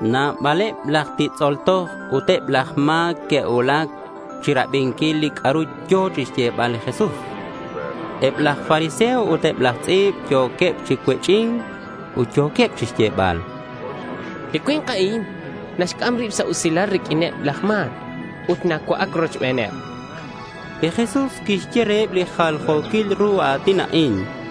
Nabaleb laj titz'ol toj ut eb laj ma̱c que'cuulac chirabinquil li c'a'ru yo̱ chixyebal li Jesús. Eb laj fariseo ut eb laj tz'i̱b yo̱queb chi cuech'i̱nc ut yo̱queb chixyebal: —Li cui̱nk a'in naxc'am rib sa' usilal riq'uineb laj ma̱c ut nacua'ac rochbeneb, chanqueb. Li Jesús quixye reheb li jaljo̱quil ru a̱tin a'in: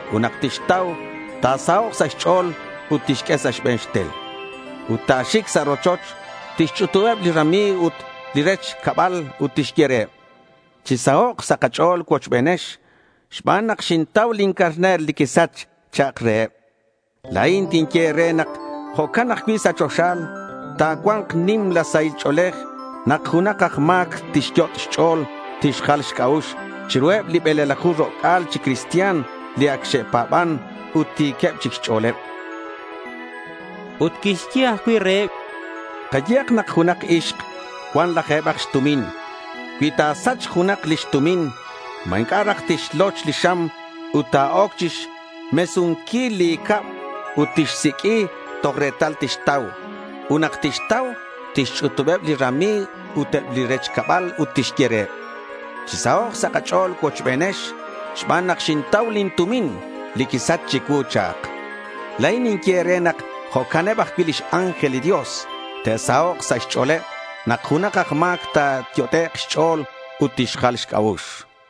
Ut nak tixtau, ta̱sahok' sa' xch'o̱l ut tixq'ue sa' xbe̱n xtel, ut ta̱xic sa' rochoch. Tixch'utubeb li rami̱g ut li rech cabal ut tixye reheb: —Chisahok' sa' kach'o̱l cuochbenex xban nak xintau lin carner li quisach, cha'ak reheb. La̱in tinye e̱re nak jo'can ajcui' sa' choxa. Ta̱cua̱nk nimla sahil ch'o̱lej nak junak aj ma̱c tixyot' xch'o̱l tixjal xc'a'ux chiruheb bele̱laju ro'c'a̱l chi cristian li ac xe'pa̱ban ut ti̱queb chic xch'o̱leb. Ut quixye ajcui' reheb: Kayehak nak junak ixk cuan laje̱bak xtumin. Cui ta̱sachk junak lix tumin, ¿ma inc'a' raj tixloch li xam ut ta̱oc chixmesunquil li cab ut tixsiq'ui toj retal tixtau? Ut nak tixtau, tixch'utubeb li rami̱g ut eb li rech cabal ut tixye reheb: —Chisahok' sa' kach'o̱l cuochbenex xban nak xintau lin tumin li quisach chicuu, cha'ak. La̱in ninye e̱re nak jo'can ajcui' eb lix ángel li Dios te'sahok' sa' xch'o̱leb nak junak aj ma̱c ta̱yot'ek' xch'o̱l ut tixjal xc'a'ux.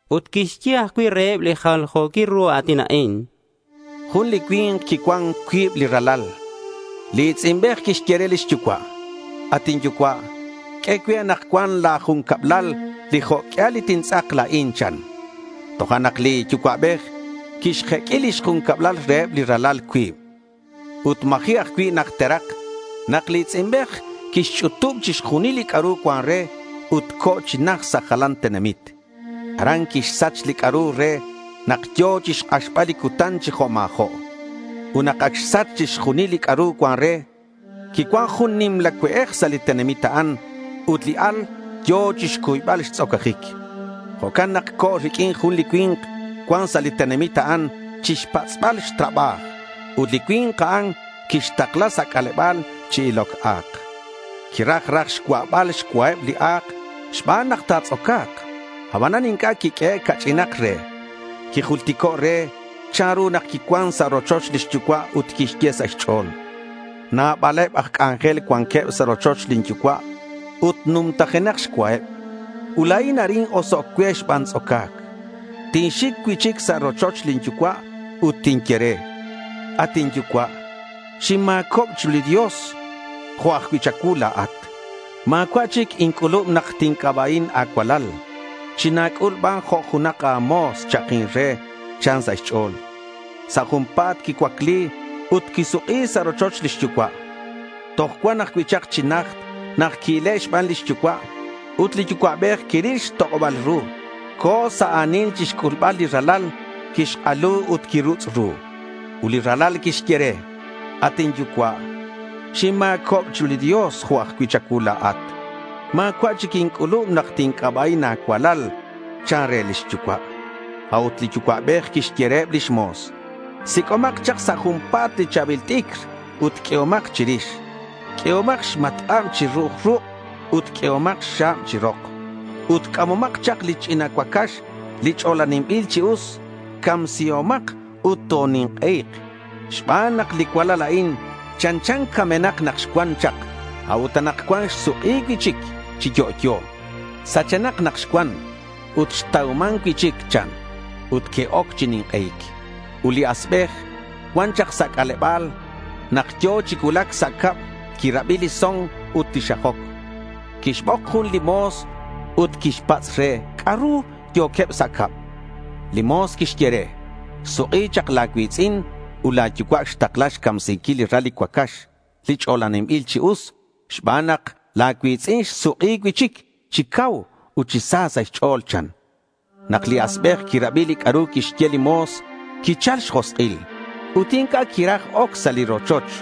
Ut quixye ajcui' reheb li jaljo̱quil ru a̱tin a'in: Jun li cui̱nk quicuan cuib li ralal. Li i̱tz'inbej quixye re lix yucua': —At inyucua', q'ue cue anakcuan la̱ jun cablal li jo' q'uial li tintz'ak la̱in, chan. Tojo'nak li yucua'bej quixjeq'ui lix jun cablal reheb li ralal cuib. Ut ma̱ji' ajcui' najterak nak li i̱tz'inbej quixch'utub chixjunil li c'a'ru cuan re, ut co̱ chi najt sa' jalanil tenamit. Aran quixsach li c'a'ru re nak yo̱ chixk'axbal li cutan chi jo' ma̱jo'. Ut nak ac xsach chixjunil li c'a'ru cuan re, quicuan jun nimla cue'ej sa' li tenamit a'an. Ut li al yo̱ chixcuybal xtz'ocajic. Jo'can nak co̱ riq'uin jun li cui̱nk cuan sa' li tenamit a'an chixpatz'bal xtrabaj. Ut li cui̱nk a'an quixtakla sa' c'aleba̱l chi iloc a̱k. Quiraj raj xcua'bal xcuaheb li a̱k xban nak ta̱tz'oca̱k. Abanan inc'a' que'xq'ue ca'ch'inak re. Quijultico' re chanru nak quicuan sa' rochoch lix yucua' ut quixye sa' xch'o̱l: —Nabaleb aj c'anjel cuanqueb sa' rochoch lin yucua' ut numtajenak xcuaheb. Ut la̱in arin osoc' cue xban tz'oca̱c. Tinxic cui'chic sa' rochoch lin yucua' ut tinye re, “At inyucua', xinma̱cob chiru li Dios jo' ajcui' cha̱cuu la̱at. Ma̱cua' chic inc'ulub nak tinc'aba'in a̱cualal. China̱c'ul ban jo' junak a̱mo̱s,” cha'akin re, chan sa' xch'o̱l. Sa' junpa̱t quicuacli ut quisuk'i sa' rochoch lix yucua'. Toj cuan ajcui' chak chi najt nak qui-ile' xban lix yucua'. Ut li yucua'bej quiril xtok'oba̱l ru. Co̱ sa' a̱nil chixc'ulbal li ralal. Quixk'alu ut quirutz' ru. Ut li ralal quixye re: —At inyucua', xinma̱cob chiru li Dios jo' ajcui' cha̱cuu la̱at. Ma̱cua' chic inc'ulub nak tinc'aba'in a̱cualal, chan re lix yucua'. A'ut li yucua'bej quixye reheb lix mo̱s: —Sic'omak chak sa' junpa̱t li cha̱bil t'icr ut q'uehomak chirix. Q'uehomak xmatk'ab chi ru'uj ruk' ut q'uehomak xxa̱b chi rok. Ut c'amomak chak li ch'ina cuacax, li ch'olaninbil chi us. Camsihomak ut tonink'ei̱k, xban nak li cualal a'in chanchan camenak nak xcuan chak. A'ut anakcuan xsuk'i cui'chic chi yo'yo. Sachenak nak xcuan ut xtauman cui'chic, chan. Ut que'oc chi nink'ei̱c. Ut li asbej cuan chak sa' c'aleba̱l. Nak yo̱ chi cuulac sa' cab, quirabi li son ut li xajoc. Quixbok jun li mo̱s ut quixpatz' re c'a'ru yo̱queb sa' cab. Li mo̱s quixye re: —Xsuk'i chak la̱ cui̱tz'in ut la̱ yucua' xtakla xcamsinquil li ral li cuacax li ch'olaninbil chi us, xban nak la̱ cui̱tz'in xsuk'i cui'chic chi cau ut chi sa sa' xch'o̱l, chan. Nak li asbej quirabi li c'a'ru quixye li mo̱s, quichal xjosk'il, ut inc'a' quiraj oc sa' li rochoch.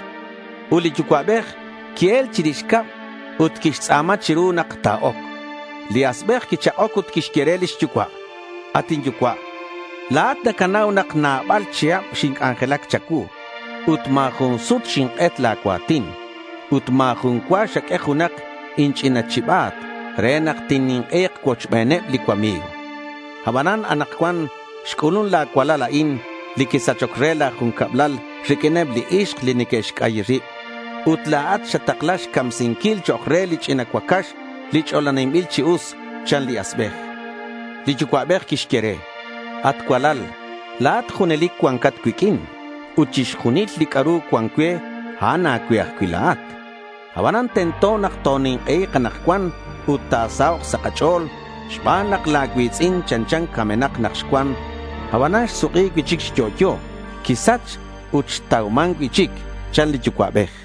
Ut li yucua'bej qui-el chirix cab ut quixtz'a̱ma chiru nak ta̱oc. Li asbej quichak'oc ut quixye re lix yucua': —At inyucua', la̱at nacanau nak nabal chihab xinc'anjelac cha̱cuu ut ma̱ jun sut xink'et la̱ cua̱tin. Ut ma̱ jun cua xaq'ue junak inch'ina chiba̱t re nak tinnink'ei̱k cuochbeneb li cuami̱g. Abanan anakcuan xc'ulun la̱ cualal a'in li quisachoc re la̱ jun cablal riq'uineb li ixk li neque'xc'ayi rib ut la̱at xatakla xcamsinquil chok' re li ch'ina cuacax li ch'olaninbil chi us, chan li asbej. Li yucua'bej quixye re: —At cualal, la̱at junelic cuancat cuiq'uin ut chixjunil li c'a'ru cuan cue, a'an a̱cue ajcui' la̱at. Abanan tento nak tonink'ei̱k anakcuan ut ta̱sahok' sa' kach'o̱l xban nak la̱ cui̱tz'in chanchan camenak nak xcuan; abanan xsuk'i cui'chic chi yo'yo. Quisach ut xtauman cui'chic, chan li yucua'bej.